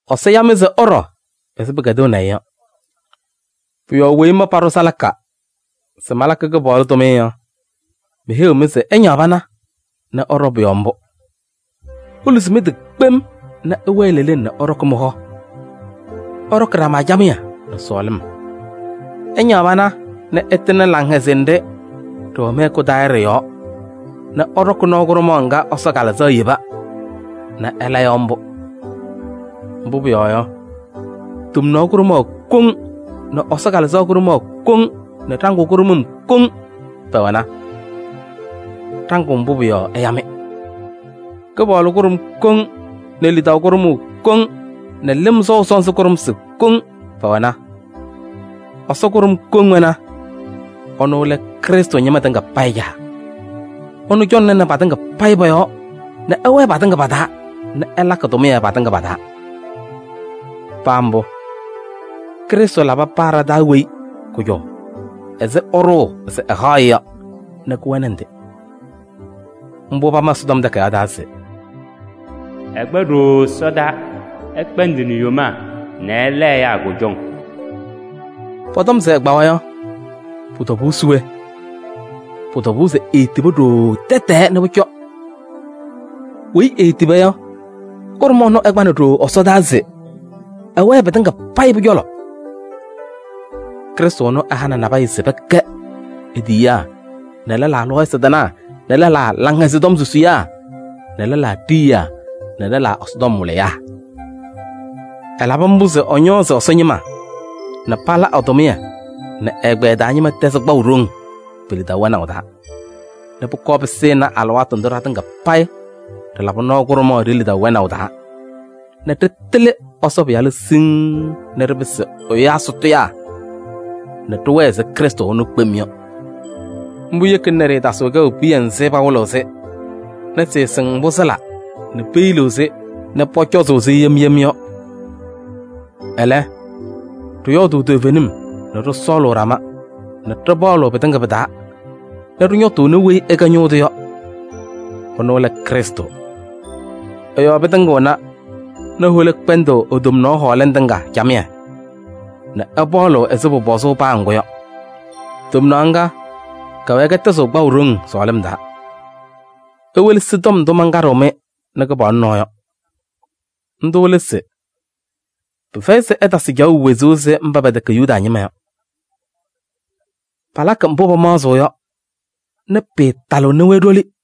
Ɛsɔ ya-mɩ se ɩɖɔ ɛzɩ pɩkɛdɩnaʋ-ɩ yɔ. Pʋ-yɔɔ weyi ma paɖʋ salaka se malakɩ Kɩpaɣlʋ tʋmɩyɛ yɔ, meheyiɣ-mɩ se ɩñaɣ pana nɛ ɩɖɔ pʋ-yɔɔ mbʋ: iluzi mɩ-tɩ kpem nɛ ɩwɛɛ leleŋ nɛ ɩɖɔkɩ mɩ-hɔ. Ɩɖɔkɩ ɖama camɩyɛ nɛ sɔɔlɩm. Ɩñaɣ pana nɛ ɩtɩŋnɩ laŋhɛzɩyɛ nɖɩ ɖɩwɛ mɩ-hɛkʋ taa yɔ ɖɩ-yɔɔ nɛ ɩɖɔkɩ nɔɔ kʋɖʋmaɣ ŋga Ɛsɔ Kalɩzaɣ yeba nɛ ɩla yɔ mbʋ. Mbʋ pʋyɔɔ yɔ, tomnaɣ kʋɖʋmaɣ koŋ nɛ Ɛsɔ Kalɩzaɣ kʋɖʋmaɣ koŋ nɛ ɖaŋʋʋ kʋɖʋmʋm koŋ pɛwɛna. Ɖaŋʋʋ mbʋ pʋ-yɔɔ ɛya-mɩ. Kɩpaɣlʋ kʋɖʋm koŋ nɛ lidaʋ kʋɖʋmʋʋ koŋ nɛ lɩm sɔʋ sɔnzɩ kʋɖʋmsɩ koŋ pɛwɛna. Ɛsɔ kʋɖʋm koŋ wɛna: ɛnʋ lɛ Krɩstʋ ñɩma tɩŋa payɩ Caa. Ɛnʋ cɔŋnɩnɩ patɩŋa pɔ-yɔɔ nɛ ɛwɛɛ patɩŋa pa-taa nɛ ɛlakɩ tʋmɩyɛ patɩŋa pa-taa. Paa mbʋ, Krɩstʋ labɩ paa ɖa-taa weyi kʋjɔʋ ɛzɩ ɛɖʋʋ se ɛhaɣ-ɩ yɔ nɛ kɩwɛnɩ ndɩ. Mbʋ pama Ɛsɔtɔm Takayaɣ taa se: “Ɛkpa ɖooo ɛsɔdaa, ɛkpɛndɩnɩ yomaa, ɛlabɩ ɛyaa kʋjɔŋ.” Pɔtɔm se ɛkpawa yɔ, pʋ-tɔbʋʋ se we? Pʋ-tɔbʋʋ se eetibi ɖooo tɛtɛɛ nɛ pʋcɔ. Weyi eetiba yɔ, kʋɖʋm ɛnʋ ɛkpanɩ ɖooo ɛsɔdaa se ɛwɛɛ pɩtɩŋa payɩ pʋ-cɔlɔ. Krɩstʋ ɛnʋ ɛhanɩ nabɛyɛ se pɛkɛ e-tiyiyaa nɛ lɛlaa lɔɔyɩsɩ tɩnaa nɛ lɛlaa Laŋhɛzɩyɛ Tɔm susiyaa nɛ lɛlaa ɖiyiyaa nɛ lɛlaa Ɛsɔtɔm wɩlɩyaa. Ɛlabɩ mbʋ se ɛñɔɔzɩ Ɛsɔ ñɩma nɛ pala ɛ-tʋmɩyɛ nɛ ɛgbɛyɛ taa ñɩma tɛzɩ kpaʋ ɖoŋ pe-lidaʋ wɛnaʋ taa nɛ pʋkɔɔ pɩsɩnɩ alɩwaatʋ ndʋ ɖatɩŋa payɩ ɖɩlabɩ nɔɔ kʋɖʋmaɣ ɖe-lidaʋ wɛnaʋ taa nɛ ɖɩtɩlɩ Ɛsɔ Pɩyalʋ siŋŋ nɛ ɖɩpɩsɩ ɛyaa sʋtʋyaa nɛ ɖɩwɛɛ ɛzɩ Krɩstʋ wɛʋ kpem yɔ. Mbʋ yekina nɛ ɖɩɩtasɩɣ kɛʋ piya nzɩ pawɩlɩɣ-sɩ nɛ sɩɩsɩŋ mbʋ sɩla nɛ peyiliɣ-sɩ nɛ pʋcɔzʋʋ-sɩ yem yem yɔ. Ɛlɛ, ɖɩyɔɔdʋʋ toovenim nɛ ɖɩsɔɔlʋʋ ɖama nɛ ɖɩpaɣlɩɣ pɩtɩŋa pɩ-taa nɛ ɖɩñɔtʋʋnɩ weyi ɛkɛ ñʋʋ tʋ yɔ, ɛnʋ lɛ Krɩstʋ. Ɛ-yɔɔ pɩtɩŋɩɣna nɛ hola kpɛndɩɣ e-tomnaɣ hɔɔlɩŋ tɩŋa camɩyɛ nɛ ɩpaɣlɩɣ ɛzɩ pʋpɔzʋʋ paa ŋgʋ yɔ. Tomnaɣ ŋga kɛwɛɛ kɛtɛzɩɣ kpaʋ ɖoŋ sɔɔlɩm taa. Iwelesi tɔm ndʋ mankaɖɩɣ-mɩ nɛ Kɩpaɣlʋ nɔɔ yɔ. Ndʋ lɛ se: pɩfɛyɩ se ɩtasɩ caɣʋ wezuu ɛzɩ mba pɛtɛkɛ Yuda ñɩma yɔ. Palakɩ mbʋ pamaɣzɩɣ nɛ pɩɩtalɩɣnɩ-wɛ ɖoli yɔ.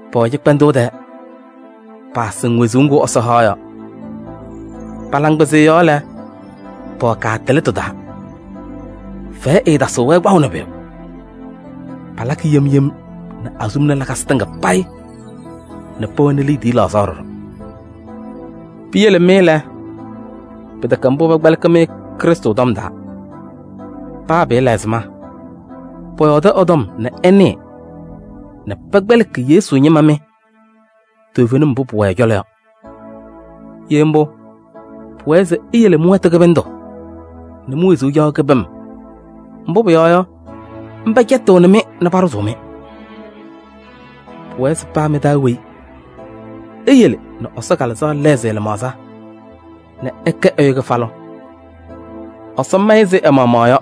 Pɛwɛ cɩkpɛndʋʋ tɛɛ, paasɩŋ wezuu ŋgʋ Ɛsɔ haɣ yɔ, pa-laŋkpɩzɩyɛ yɔɔ lɛ, pɛwɛ kaatɩlɩtʋ taa. Fɛyɛ ɛɛtasɩɣ-wɛ kpaʋ nɛ pʋyʋ, palakɩ yem yem nɛ azuluma lakasɩ tɩŋa payɩ nɛ pɛwɛnɩ liidiye laɣzaɣ ɖɔɖɔ. Piyele mɩ lɛ, pɩtɛkɛ mbʋ pɛkpɛlɩkɩ-mɩ Krɩstʋ tɔm taa. Paa pɩlabɩ ɛzɩma, pɔyɔɔdɩ ɛ-tɔm nɛ ɩnɩɩ nɛ pɛkpɛlɩkɩ Yesu ñɩma mɩ toovenim mbʋ pʋwɛ ɛ-cɔlɔ yɔ. Ye mbʋ, pʋwɛɛ se iyele mɩ-wɛtʋ kɩbɩndʋ nɛ mi-wezuu caɣʋ kɩbɩm, mbʋ pʋyɔɔ yɔ, mba cɛtɩɣnɩ-mɩ nɛ paɖʋzʋʋ-mɩ. Pʋwɛɛ se paa mɩ-taa weyi eyele nɛ Ɛsɔ Kalɩzaɣ lɛɣzɩ ɛ-lɩmaɣza nɛ ɛkɛ ɛyʋ kɩfalʋ. Ɛsɔ ma-ɩ ɛzɩ ɛ-maɣmaɣ yɔ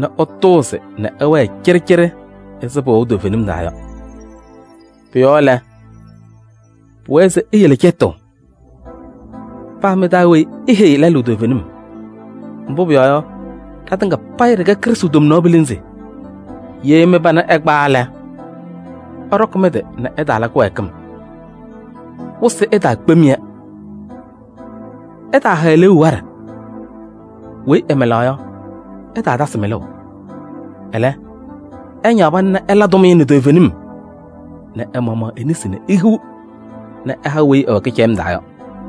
nɛ ɛtʋʋzɩ nɛ ɛwɛɛ cɩɖɩcɩɖɩ ɛzɩ pɩwɛʋ toovenim taa yɔ. Pʋ-yɔɔ lɛ, pʋwɛɛ se iyele cɛtʋʋ: paa mɩ-taa weyi eheyi lɛlʋ toovenim. Mbʋ pʋyɔɔ yɔ, ɖatɩŋa payɩ ɖɩkɛ Krɩstʋ tomnaɣ pilinzi. Ye mɩ-pana ɛkpawa lɛ, ɩɖɔkɩ mɩ-tɩ nɛ ɩtaala kɩwɛɛkɩm, wɩsɩ ɛtaakpem-yɛ. Ɩtaaha eleeu waɖɛ. Weyi ɛmɩlaɣ yɔ, ɛtaatasɩ mɩlʋʋ. Ɛlɛ, ɛñaɣ pana nɛ ɛla tʋmɩyɛ nɛ toovenim nɛ ɛ-maɣmaɣ e-nesi nɛ ehiɣ nɛ ɛha weyi ɛwɛ kɩcɛyɩm taa yɔ.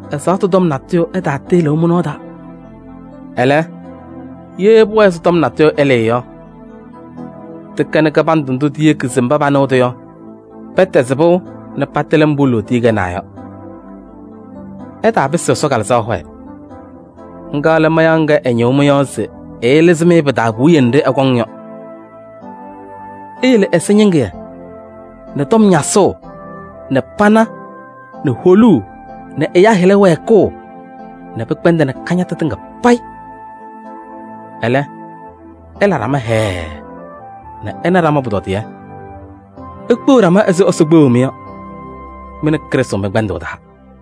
Ɛzaɣtʋ tɔm natʋyʋ ɛtaalɩɩ mɩ-nɔɔ taa. Ɛlɛ, ye pʋwɛɛ se natʋyʋ ɛlɩɩ yɔ, tɩkɛnɩ kɩbandʋ ndʋ tiyeki se mba panɩɣ-tʋ yɔ, pɛtɛzɩ pɩʋ nɛ patɩlɩ mbʋ lootiye kɛnaa yɔ. Ɩtaapɩsɩ Ɛsɔ Kalɩzaɣ hɔyɛ, ŋga lɛ mayaɣ ŋga ɛñɩɣ mɩ-yɔɔ se ɛɛlɩzɩ-mɩ pɩ-taa puwiye nɖɩ ɛkɔŋ yɔ. Iyele ɛzɩñɩŋɩyɛ nɛ tɔm ñasʋʋ nɛ pana nɛ holuu nɛ ɛyaa hɩla wɛɛkʋʋ nɛ pɩkpɛndɩnɩ kañatʋ tɩŋa payɩ. Ɛlɛ, ɩla ɖama hɛɛɛ nɛ ɩna ɖama pʋtɔdɩyɛ. Ikpeɣ ɖama ɛzɩ Ɛsɔ kpeɣu-mɩ yɔ, mɩ nɛ Krɩstʋ mɩ-kpɛndʋʋ taa.